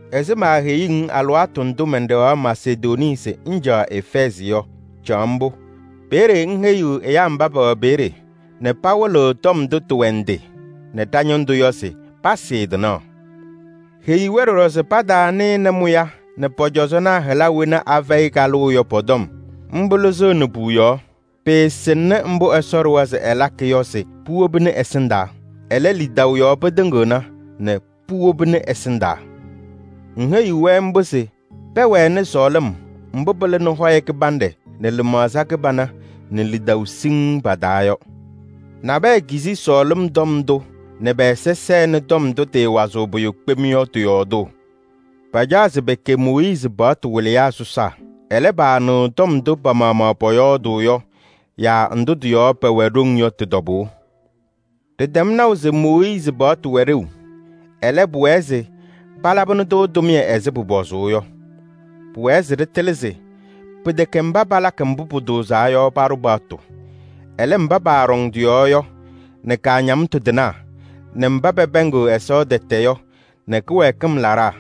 Ɛzɩ maaheyuu-ŋ alɩwaatʋ ndʋ mɛnɖɛɣaɣ Masedonii se ŋcaɣ Efɛɛzɩ yɔ, caɣ mbʋ. Peeye ŋheyiɣ ɛyaa mba pɛwɛ peeye nɛ pawɩlɩɣ tɔm ndʋ tɩwɛ ndɩ nɛ ɖa-ñɩndʋ yɔ se pasɩɩ tɩnaɣ. Heyi-wɛ ɖɔɖɔ se pataanɩnɩ mʋya nɛ pɔ-cɔzɔnaa hɩla wena afɛyɩ kalʋʋ yɔ pɔ-tɔm. Mbʋ lɩzɩɣnɩ puuyaɣ. Pɩɩsɩŋnɩ mbʋ Ɛsɔ ɖʋwa se ɛlakɩ yɔ se puwobini ɛsɩndaa. Ɛlɛ, lidaʋ yɔɔ pɩtɩŋɩɣna nɛ puwobini ɛsɩndaa. Ŋheyiɣ-wɛ mbʋ se pɛwɛnɩ sɔɔlɩm mbʋ pɩlɩnɩ hɔyɛ kɩbanɖɛ nɛ lɩmaɣza kɩbana nɛ lidaʋ siŋŋ pa-taa yɔ. Nabɛyɛ kizi sɔɔlɩm tɔm ndʋ nɛ pɛ-ɛza sɛnɩ tɔm ndʋ tɩɩwazɩɣ pʋyʋ kpem yɔ tɩ-yɔɔdʋʋ. Pacaɣ se pɛkɛ Mooyiizi paɣtʋ wɩlɩyaa sɔsaa. Ɛlɛ, paanɩɣ tɔm ndʋ pa-maɣmaɣ pɔyɔɔdʋʋ yɔ yaa ndʋ tɩ-yɔɔ pɛwɛ ɖoŋ yɔ tɩ-tɔbʋʋ. Ɖɩtɛm naʋ se Mooyiizi paɣtʋ wɛ ɖeu. Ɛlɛ, pʋwɛɛ se palabɩnɩ-tʋ tʋmɩyɛ ɛzɩ pʋpɔzʋʋ yɔ. Pʋwɛɛ se ɖɩtɩlɩ se: pɩtɛkɛ mba palakɩ mbʋ pʋtʋʋzaa yɔ paɖʋ paɣtʋ. Ɛlɛ, mba paaɖɔŋ tɩ-yɔɔ yɔ nɛ kaañamtʋ tɩnaa nɛ mba pɛpɛɛŋɩɣ Ɛsɔ tɛtɛ yɔ nɛ kɩwɛɛkɩm laɖaa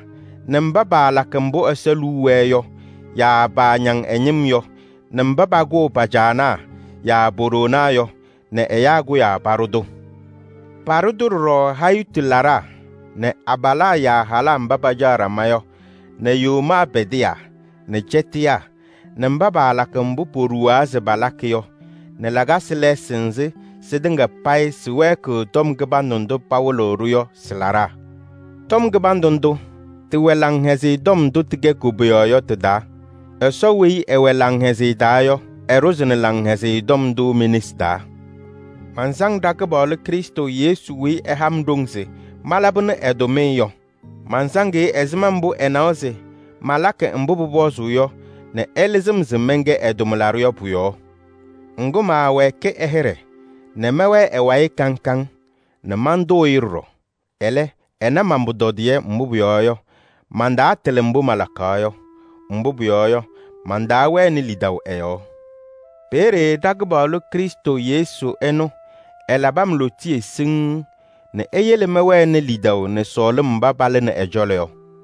nɛ mba paalakɩ mbʋ Ɛsɔ liu wɛɛ yɔ yaa paañaŋ ɛ-ñɩm yɔ nɛ mba pakʋʋ pa-caanaa yaa po-ɖoonaa yɔ nɛ ɛyaa kʋyaa paɖʋ-tʋ. Paɖʋ-tʋ ɖɔɖɔ hayitu laɖaa nɛ abalaa yaa halaa mba pacaɣ ɖama yɔ nɛ yomaa pɛdɩyaa nɛ cɛtɩyaa nɛ mba paalakɩ mbʋ poɖuwaa se palakɩ yɔ nɛ lakasɩ lɛɛsɩ nzɩ sɩtɩŋa payɩ sɩwɛɛkɩɣ tɔm kɩbandʋ ndʋ pawɩlɩɣ-ɖʋ yɔ sɩ-laɖaa. Tɔm kɩbandʋ ndʋ, tɩwɛ Laŋhɛzɩyɛ Tɔm ndʋ tɩkɛ koboyaɣ yɔ tɩ-taa. Ɛsɔ weyi ɛwɛ laŋhɛzɩyɛ taa yɔ, ɛɖʋzɩnɩ Laŋhɛzɩyɛ Tɔm ndʋ me-nesi taa. Mansaŋ ɖa-Kɩpaɣlʋ Krɩstʋ Yesu weyi ɛha-m ɖoŋ se malabɩnɩ ɛ-tʋmɩyɛ yɔ. Mansaŋ-ɩ ɛzɩma mbʋ ɛnawa se malakɩ mbʋ pʋpɔzʋʋ yɔ nɛ ɛlɩzɩ-m se mɛnkɛ ɛ-tʋmlaɖʋ yɔ pʋ-yɔɔ. Ŋgʋ, maawɛɛkɩ ɛ-hɩɖɛ nɛ mɛwɛɛ ɛ-wayɩ kaŋ kaŋ nɛ mantʋʋ-ɩ ɖɔɖɔ. Ɛlɛ, ɛna man-pʋtɔdɩyɛ, mbʋ pʋyɔɔ yɔ, mantaatɩlɩ mbʋ malakaɣ yɔ. Mbʋ pʋyɔɔ yɔ, mantaawɛnɩ lidaʋ ɛ-yɔɔ. Peeye ɖa-Kɩpaɣlʋ Krɩstʋ Yesu ɛnʋ ɛlabɩ-m lootiye siŋŋ nɛ eyele mɛwɛnɩ lidaʋ nɛ sɔɔlɩm mba palɩnɩ ɛ-cɔlɔ yɔ.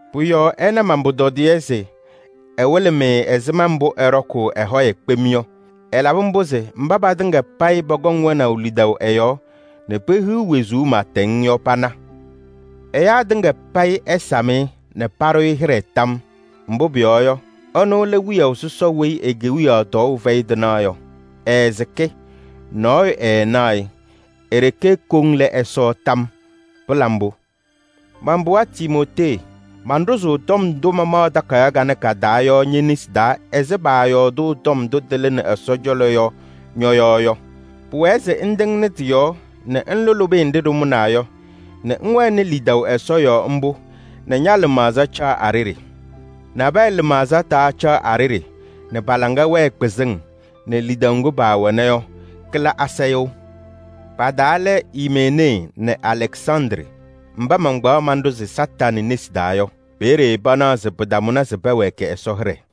Pʋ-yɔɔ ɛna man-pʋtɔdɩyɛ se ɛwɩlɩ-mɩ ɛzɩma mbʋ ɛɖɔkʋʋ ɛ-hɔyɛ kpem yɔ. Ɛlabɩ mbʋ se mba patɩŋa payɩ pɔkɔŋ wɛnaʋ lidaʋ ɛ-yɔɔ nɛ pehiɣ wezuu pɩɩtɛŋ yɔ pana. Ɛyaa tɩŋa payɩ ɛsam-ɩ nɛ paɖʋ-ɩ hɩɖɛ tam yɔɔ. Mbʋ pʋyɔɔ yɔ, ɛnʋ lɛ Wiyaʋ sɔsɔ weyi e-kewiyaɣ tɔɔʋ fɛyɩ tɩnaɣ yɔ, ɛɛsɩkɩ, nɔɔyʋ ɛɛnaɣ-ɩ, e-ɖeke koŋ lɛ Ɛsɔ tam yɔɔ! Pɩla mbʋ! Man-pɩɣa Timootee, manɖʋzʋʋ tɔm ndʋ mamaɣ takayaɣ kanɛ ka-taa yɔ ñe-nesi taa ɛzɩ paayɔɔdʋʋ tɔm ndʋ tɩlɩnɩ Ɛsɔ cɔlɔ yɔ ñɔ-yɔɔ yɔ. Pʋwɛɛ se ŋtɩŋnɩ tɩ-yɔɔ nɛ ŋlʋ lʋbɩyɛ nɖɩ ɖɩmʋnaa yɔ nɛ ŋwɛnɩ lidaʋ Ɛsɔ yɔɔ mbʋ nɛ ña-lɩmaɣza caɣ a-ɖeɖe. Nabɛyɛ lɩmaɣza taacaɣ a-ɖeɖe nɛ pa-laŋa wɛɛ kpɩzɩŋ nɛ lidaʋ ŋgʋ paawɛna yɔ kɩla asayʋʋ. Pa-taa lɛ Imenee nɛ Alɛksandrɩ mba mankpaɣ manɖʋzɩ Kañadʋ Satanɩ nesi taa yɔ. Peeye panaɣ se pɩtamʋnɩ se pɛwɛɛkɩ Ɛsɔ hɩɖɛ.